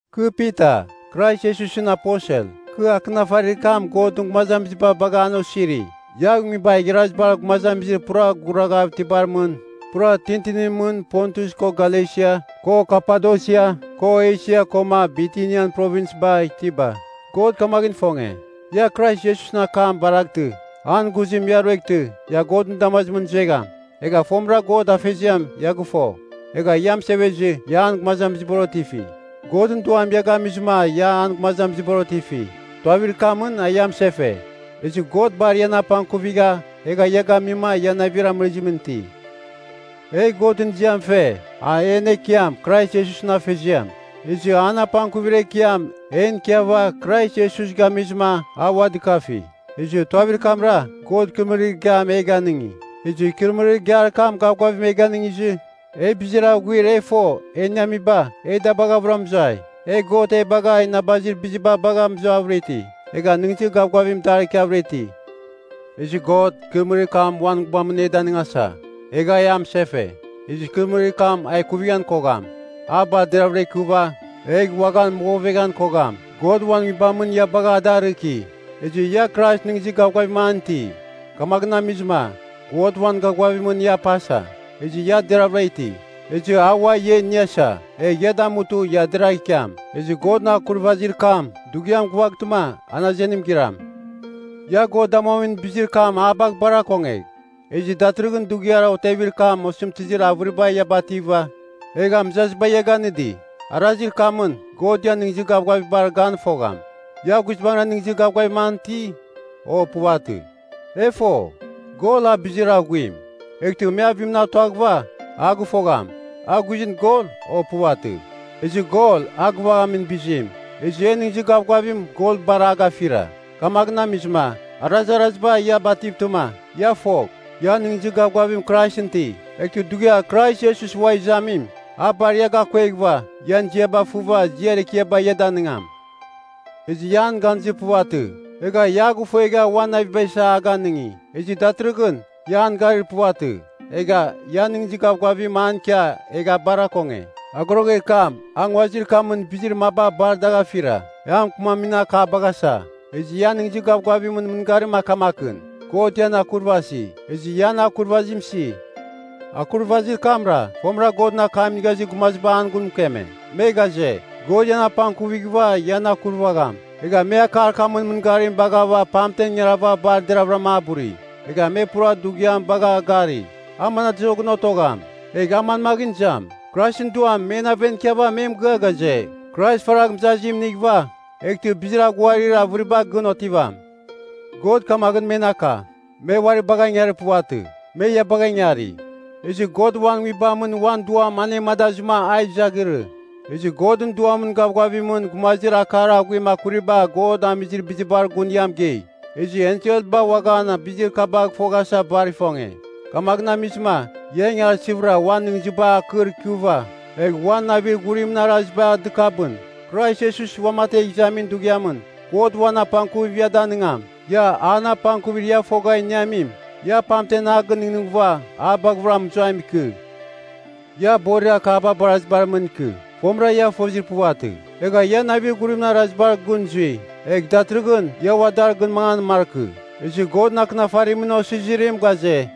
Kɨ Pita, Krais Iesusɨn aposel. Kɨ akɨnafarir kam Godɨn gumazamiziba bagha an osiri, ia nguibar igharazibar gumazamizir pura guraghav itibar mɨn, pura tintinimɨn Pontus ko Galesia, ko Kapadosia, ko Esia koma Bitinian Provinsba itiba. God kamaghɨn ifonge, ia Krais Iesusɨn akam baraghtɨ, an ghuzim ia rueghtɨ ia Godɨn damazimɨn zuegham. Egha fomɨra God Afeziam ia gɨfo, egha ia mɨsevezɨ ia an gumazamizibar otifi. Godɨn Duam ia gamizɨma ia an gumazamizibar otifi, tuavir kamɨn a ia mɨsefe. Ezɨ God bar ian apangkuvigha egha ia gamima ia navir amɨrizimɨn iti. E Godɨn ziam fe, a en Ekiam Krais Iesusɨn Afeziam! Ezɨ an apangkuvir ekiam en ikiava Krais Iesus gamizɨma a ua dɨkafi, ezɨ tuavir kamra, God ikɨrɨmɨrir igiam e ganɨngi. Ezɨ ikɨrɨmɨrir igiar kam gavgavim e ganɨngizɨ, e bizir aghuir e fo e iniaba, e da baghavɨra mɨzuai. E God e bagha inabazir biziba bagha mɨzuavɨra iti, egha nɨghnɨzir gavgavim dar ikiavɨra iti. Ezɨ God, ikɨrɨmɨrir kam uan Nguibamɨn e danɨngasa, egha e amɨsefe. Ezɨ ikɨrɨmɨrir kam a ikuvighan kogham. A bar deraghavɨra ikɨva, egh uaghan mɨgoveghan kogham. God uan Nguibamɨn ia bagha a da arɨki. Ezɨ ia Krais nɨghnɨzir gavgavim an iti, kamaghɨn amizɨma God uan gavgavimɨn ia pasa, ezɨ ia deravɨra iti. Ezɨ a ua ia iniasa, egh ia damutɨ ia deragh ikiam. Ezɨ Godɨn akurvazir kam, dughiam gɨvaghtɨma an azenim giram. Ia, God damuamin bizir kam a bagh bar akongegh. Ezɨ datɨrɨghɨn dughiar otevir kam osɨmtɨzir avɨriba ia bativa, egha mɨzaziba ia ganɨdi. Arazir kamɨn God ian nɨghnɨzir gavgavibar gan fogham, ia guizbangɨra nɨghnɨzir gavgavim an iti, o puvatɨ. E fo, gol a bizir aghuim, eghtɨ me avimɨn a tuaghɨva, a gɨfogham, a guizɨn gol, o puvatɨ. Ezɨ gol a gɨvaghamin bizim. Ezɨ en nɨghnɨzir gavgavim gol bar a gafira. Kamaghɨn amizɨma arazaraziba ia bativtɨma, ia fogh, ia nɨghnɨzir gavgavim Kraisɨn iti. Eghtɨ dughiar Krais Iesus ua izamim, a bar ia gakueghɨva, ian ziaba fɨva ziar ekiaba ia danɨngam. Ezɨ ia an ganizir puvatɨ, egha ia a gɨfuegha uan naviba isa a ganɨngi. Ezɨ datɨrɨghɨn ia an gari puvatɨ, egha ia nɨghnɨzir gavgavim an ikia egha bar akonge. Agoroger kam a nguazir kamɨn bizir maba bar dagh afira, e a mɨkɨmamin akabagh asa. Ezɨ ian nɨghnɨzir gavgavimɨn mɨngarim a kamakɨn, God ian akurvasi. Ezɨ ia an akurvazim isi. Akurvazir kamra, fomɨra Godɨn akam inigha izir gumaziba an gun mɨkeme. Me ghaze, God ian apangkuvighɨva ian akurvagham. Egha me akar kamɨn mɨngarim baghava pamtem ingarava bar deravɨrama a buri. Egha me pura dughiam bagha gari, a manadozoghɨn otogham, egh a manmaghɨn izam. Kraisɨn Duam men aven ikiava me mɨgɨa ghaze, Krais faragh mɨzazim inighɨva, eghtɨ bizir aghuarir avɨriba gɨn otivam. God kamaghɨn men aka, me uari bagha ingarir puvatɨ, me ia bagha ingari. Ezɨ God uan nguibamɨn uan Duam anemadazɨma a izaghɨrɨ, ezɨ Godɨn Duamɨn gavgavimɨn gumazir akar aghuim akuriba God amizir bizibar gun ia mɨgei. Ezɨ enselba uaghan bizir kabagh foghasa bar ifonge. Kamaghɨn amizɨma ia ingarsɨvɨra uan nɨghnɨziba akɨr ikɨva, egh uan navir ghurimɨn araziba dɨkabɨn. Krais Iesus uamategh izamin dughiamɨn God uan apangkuvim ia danɨngam. Ia an apangkuvir ia fogha iniamim, ia pamtem a gɨnɨghnɨghɨva a baghɨvɨra mɨzuam ikɨ. Ia borir akaba barazibar mɨn ikɨ. Fomɨra ia fozir puvatɨ, egha ia navir ghurimɨn arazir kurabar gɨn zui, egh datɨrɨghɨn ia ua dar gɨn mangan markɨ. Ezɨ Godɨn akɨnafarimɨn osizirim ghaze,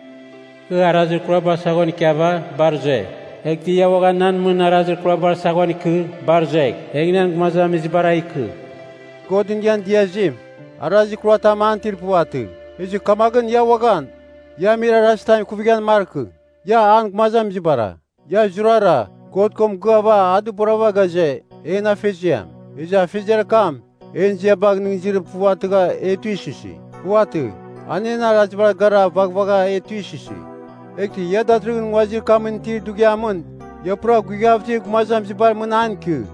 “Kɨ arazir kurabar saghon ikiava, bar zue, eghtɨ ia uaghan nan mɨn arazir kurabar saghon ikɨ, bar zuegh, egh nan gumazamizibara ikɨ.” Godɨn ian diazim, arazir kuratam an itir puvatɨ. Eghtɨ kamaghɨn ia uaghan, ia amir arazitam ikuvighan markɨ. Ia, an gumazamizibara. Ia zurara, God ko mɨgɨava a dɨborava ghaze, En Afeziam. Ezɨ Afeziar kam en ziabagh nɨghnɨzir puvatɨgha e tuisɨsi. Puvatɨ. An en arazibar gara vaghvagha e tuisɨsi. Eghtɨ ia datɨrɨghɨn nguazir kamɨn itir dughiamɨn ia pura guighav itir gumazamizibar mɨn an ikɨ.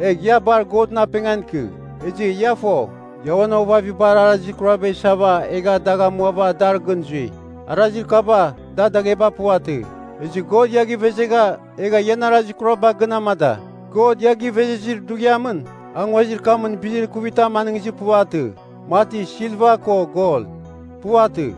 Egh ia bar Godɨn apengan ikɨ. Ezɨ ia fo, ia uan ovavabar arazir kuraba isava egha dagh amuava dar gɨn zui. Arazir kaba da dagheba Puvatɨ. Ezɨ God ia givezegha egha ian arazir kuraba gɨn amada. God ia givezezir dughiamɨn, a nguazir kamɨn bizir ikuvitam anɨngizir puvatɨ, mati silva ko gol. Puvatɨ.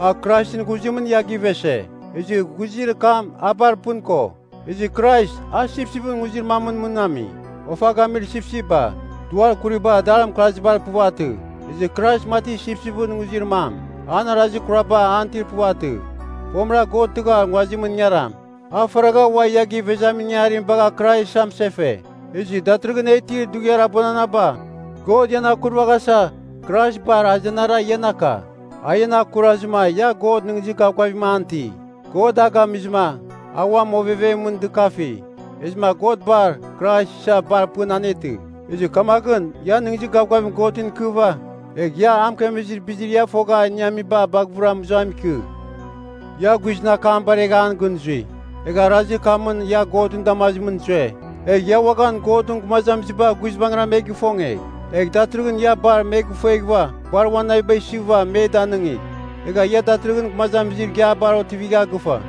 A Kraisɨn ghuzimɨn ia givese, ezɨ ghuzir kam a bar pɨn ko. Ezɨ Krais a sipsipɨn nguzir mamɨn mɨn ami. Ofa gamir sipsipba, duar kuriba dar mɨkarzibar puvatɨ, ezɨ Krais mati sipsipɨn nguzir mam, an arazir kuraba an itir puvatɨ. Fomɨra God tɨghar nguazimɨn ingaram, a faragha ua ia givezamin ingangarim bagha Krais amɨsefe. Ezɨ datɨrɨghɨn e itir dughiar abuananaba, God ian akurvaghasa Krais bar azenara ian aka. A ian akurazɨma ia God nɨghnɨzir gavgavim an iti. God a gamizɨma a uam ovevemɨn dɨkafi, ezɨma God bar Krais isa bar pɨn anetɨ. Ezɨ kamaghɨn ia nɨghnɨzir gavgavim Godɨn ikɨva, egh ia a mɨkemezir bizir ia fogha iniamiba baghɨvɨra mɨzuam ikɨ. Ia guizɨn akam baregha an gɨn zui, egha arazir kamɨn ia Godɨn damazimɨn zue. Egha ia uaghan Godɨn gumazamiziba guizbangɨra me gifonge. Egh datɨrɨghɨn ia bar me gifueghɨva, bar uan naviba isɨva me danɨngigh. Egha ia datɨrɨghɨn gumazamizir igiabar otivigha gɨfa,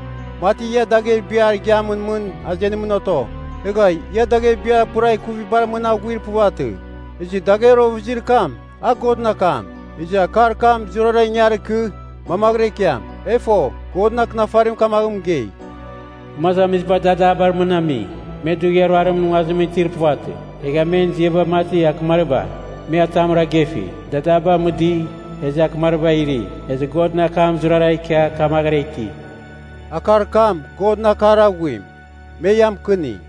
mati ia dagher biar igiamɨn mɨn azenimɨn oto. Egha ia dagher biar pura ikuvibar mɨn aghuir puvatɨ. Ezɨ dagher ovɨzir kam, a Godɨn akam, ezɨ akar kam zurara ingar ikɨ, mamaghɨra ikiam. E fo, Godɨn Akɨnafarim kamaghɨn mɨgei, “Gumazamiziba dadabar mɨn ami, me dughiar ruarimɨn nguazimɨn itir puvatɨ. Egha men ziaba mati akɨmariba, me atamra gefi. Dadaba mɨdɨi, ezɨ akɨmariba iri. Ezɨ Godɨn akam zurara ikia kamaghɨra iti.” Akar kam Godɨn akar aghuim, me ia mɨkɨni.